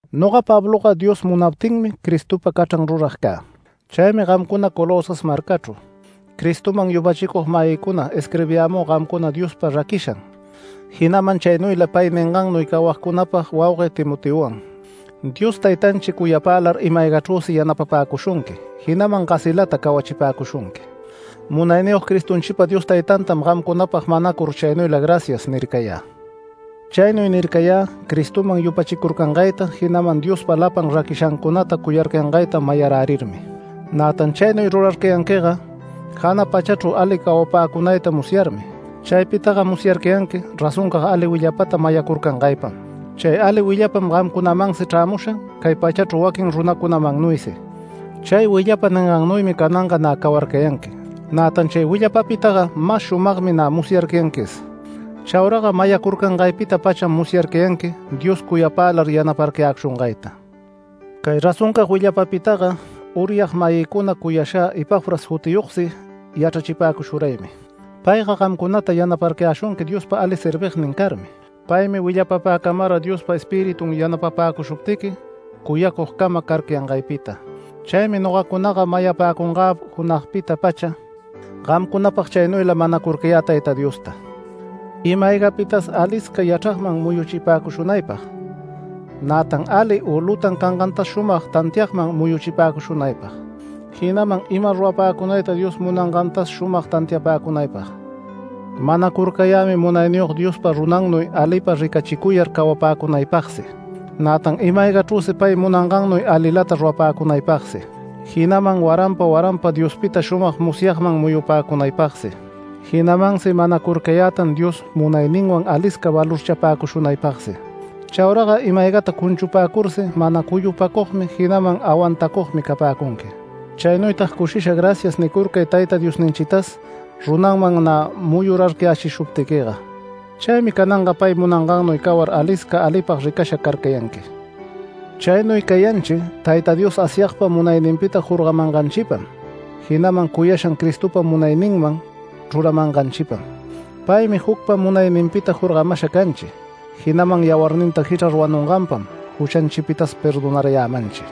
Noga Pabloga Dios munaptinmi Cristopa cachran rurag cä. Chaymi gamcuna Colosas marcachru Cristoman yupachicug-mayïcuna isquirbiyämü gamcuna Diospa raquishan, jinaman chaynuyla pay ningannuy cawagcunapag waugue Timoteowan. Dios Taytanchi cuyapälar ima-aygachrüsi yanapapäcushunqui, jinaman gasilata cawachipäcushunqui. Munayniyog Cristonchipa Dios Taytantam gamcunapag manacur chaynuyla “Gracias” nircayä. Chaynuy nircayä Cristoman yupachicurcangayta, jinaman Diospa lapan raquishancunata cuyarcayangayta mayarärirmi. Nätan chaynuy rurarcayanquiga, jana pachachru ali cawapäcunayta musyarmi. Chaypitaga musyarcayanqui razoncag ali willapata mayacurcangaypam. Chay ali willapam gamcunamansi chrämusha cay pachachru waquin runacunamannuysi. Chay willapa ningannuymi cananga nä cawarcayanqui, nätan chay willapapitaga mas shumagmi nä musyarcayanquis. Chauraga mayacurcangaypita-pacham musyacarcayanqui Dios cuyapälar yanaparcayäshungayta. Cay razoncag willapapitaga uryag-mayïcuna cuyashä Epafras jutiyogsi yachrachipäcushuraymi. Payga gamcunata yanaparcayäshunqui Diospa ali servignin carmi. Paymi willapapäcamara Diospa Espiritun yanapapäcushuptiqui cuyacugcama carcayangaypita. Chaymi nogacunaga mayapäcungä junagpita-pacha, gamcunapag chaynuyla manacurcayä Tayta Diosta, ima-aygapitas alisca yachragman muyuchipäcushunaypag, nätan ali u lutan cangantas shumag tantiagman muyuchipäcushunaypag, jinaman ima rurapäcunayta Dios munayangantas shumag tantiapäcunaypag. Manacurcayämi Munayniyog Diospa runannuy alipa ricachicuyar cawapäcunaypagsi, nätan ima-aygachrüsi pay munangannuy alilata rurapäcunaypagsi, jinaman waranpa waranpa Diospita shumag musyagman muyupäcunaypagsi. Jinamansi manacurcayätan Dios munayninwan alisca valorchapäcushunaypagsi. Chauraga ima-aygata cunchupäcursi mana cuyupacugmi, jinaman awantacugmi capäcunqui. Chaynuytag cushisha “Gracias” nicurcay Tayta Diosninchitas runanman nä muyurarcayächishuptiquiga. Chaymi cananga pay munangannuy cawar alisca alipag ricasha carcayanqui. Chaynuy cayanchi Tayta Dios Asyagpa munayninpita jorgamanganchipam, jinaman cuyashan Cristopa munayninman chruramanganchipam. Paymi jucpa munayninpita jorgamasha canchi, jinaman yawarninta jichrar wanunganpam juchanchipitas perdonarayämanchi.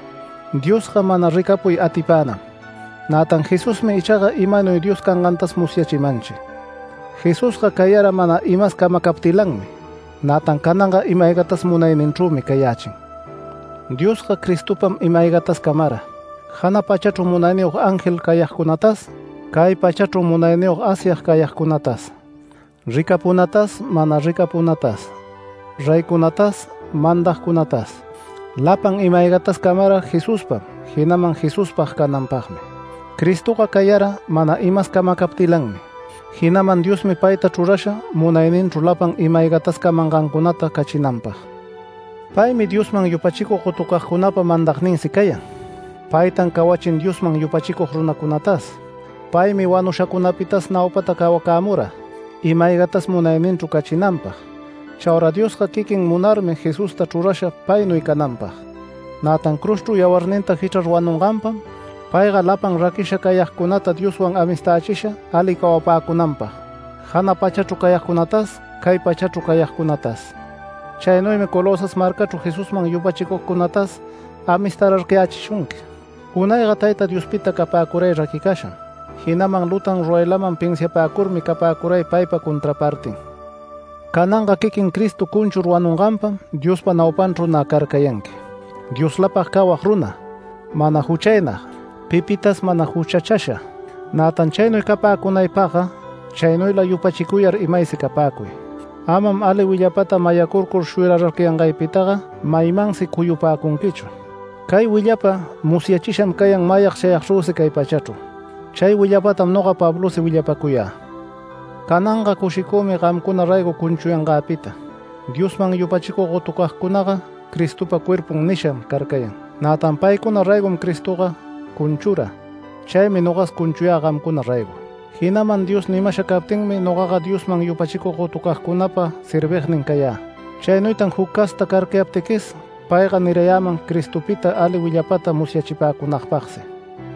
Diosga mana ricapuy atipänam, nätan Jesusmi ichaga imanuy Dios cangantas musyachimanchi. Jesusga cayara mana imas camacaptilanmi, nätan cananga ima-aygatas munayninchrümi cayächin. Diosga Cristopam ima-aygatas camara, jana pachachru munayniyog ángel cayagcunatas, cay pachachru munayniyog Asyag cayagcunatas ricapunatas mana ricapunatas reycunatas mandagcunatas. Lapan ima-aygatas camara Jesuspam, jinaman Jesuspag cananpagmi. Cristoga cayara mana imas camacaptilanmi, jinaman Diosmi payta chrurasha munayninchru lapan ima-aygatas camangancunata cachinanpag. Paymi Diosman yupachicug gotucagcunapa mandagninsi cayan. Paytan cawachin Diosman yupachicug runacunatas. Paymi wanushacunapitas naupata cawacämura, ima-aygatas munayninchru cachinanpag. Chaura Diosga quiquin munarmi Jesusta chrurasha paynuy cananpag. Nätan cruzchru yawarninta jichrar wanunganpam, payga lapan raquicasha cayagcunata Dioswan amistächisha ali cawapäcunanpag, jana pachachru cayagcunatas, cay pachachru cayagcunatas. Chaynuymi Colosas marcachru Jesusman yupachicugcunatas amistararcayächishunqui. Unayga Tayta Diospita capäcuray raquicasham, jinaman lutan ruraylaman pinsiapäcurmi capäcuray paypa contrapartin. Cananga quiquin Cristo cunchur wanunganpam, Diospa naupanchru nä carcayanqui, Dioslapag cawag runa, mana juchaynag, pipitas mana juchachasha. Nätan chaynuy capäcunaypagga chaynuyla yupachicuyar imaysi capäcuy. Amam ali willapata mayacurcur shuyararcayangaypitaga maymansi cuyupäcunquichu. Cay willapa musyachisham cayan mayag chayagchrüsi cay pachachru. Chay willapatam noga Pablosi willapacuyä. Cananga cushicümi gamcuna raygo cunchuyangäpita. Diosman yupachicug gotucagcunaga Cristopa cuerpun nisham carcayan, nätan paycuna raygom Cristoga cunchura. Chaymi nogas cunchuyä gamcuna raygo. Jinaman Dios nimasha captinmi nogaga Diosman yupachicug gotucagcunapa servignin cayä. Chaynuytan juc casta carcayaptiquis, payga nirayäman Cristopita ali willapata musyachipäcunagpagsi.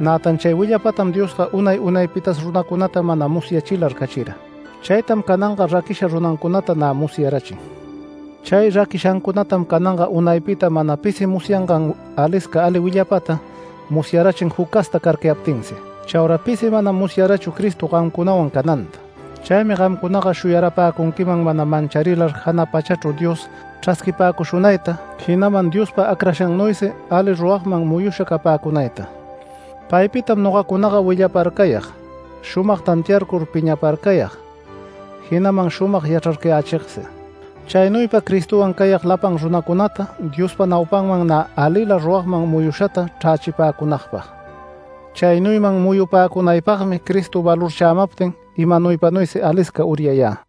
Nätan chay willapatam Diosga unay unaypitas runacunata mana musyachilar cachira. Chaytam cananga raquisha runancunata nä musyarachin. Chay raquishancunatam cananga unaypita mana pisi musyangan alisca ali willapata musyarachin juc casta carcayaptinsi. Chaura pisi manam musyarachu Cristo gamcunawan cananta. Chaymi gamcunaga shuyarapäcunquiman mana mancharilar jana pachachru Dios chrasquipäcushunayta, jinaman Diospa acrashannuysi ali ruragman muyusha capäcunayta. Paypitam nogacunaga willaparcayag, shumag tantiarcur piñaparcayag, jinaman shumag yachrarcayächigsi. Chaynuypa Cristowan cayag lapan runacunata, Diospa naupanman nä alila ruragman muyushata chrächipäcunäpag. Chaynuyman muyupäcunanpagmi Cristo valorchämaptin imanuypanuysi alisca uryayä.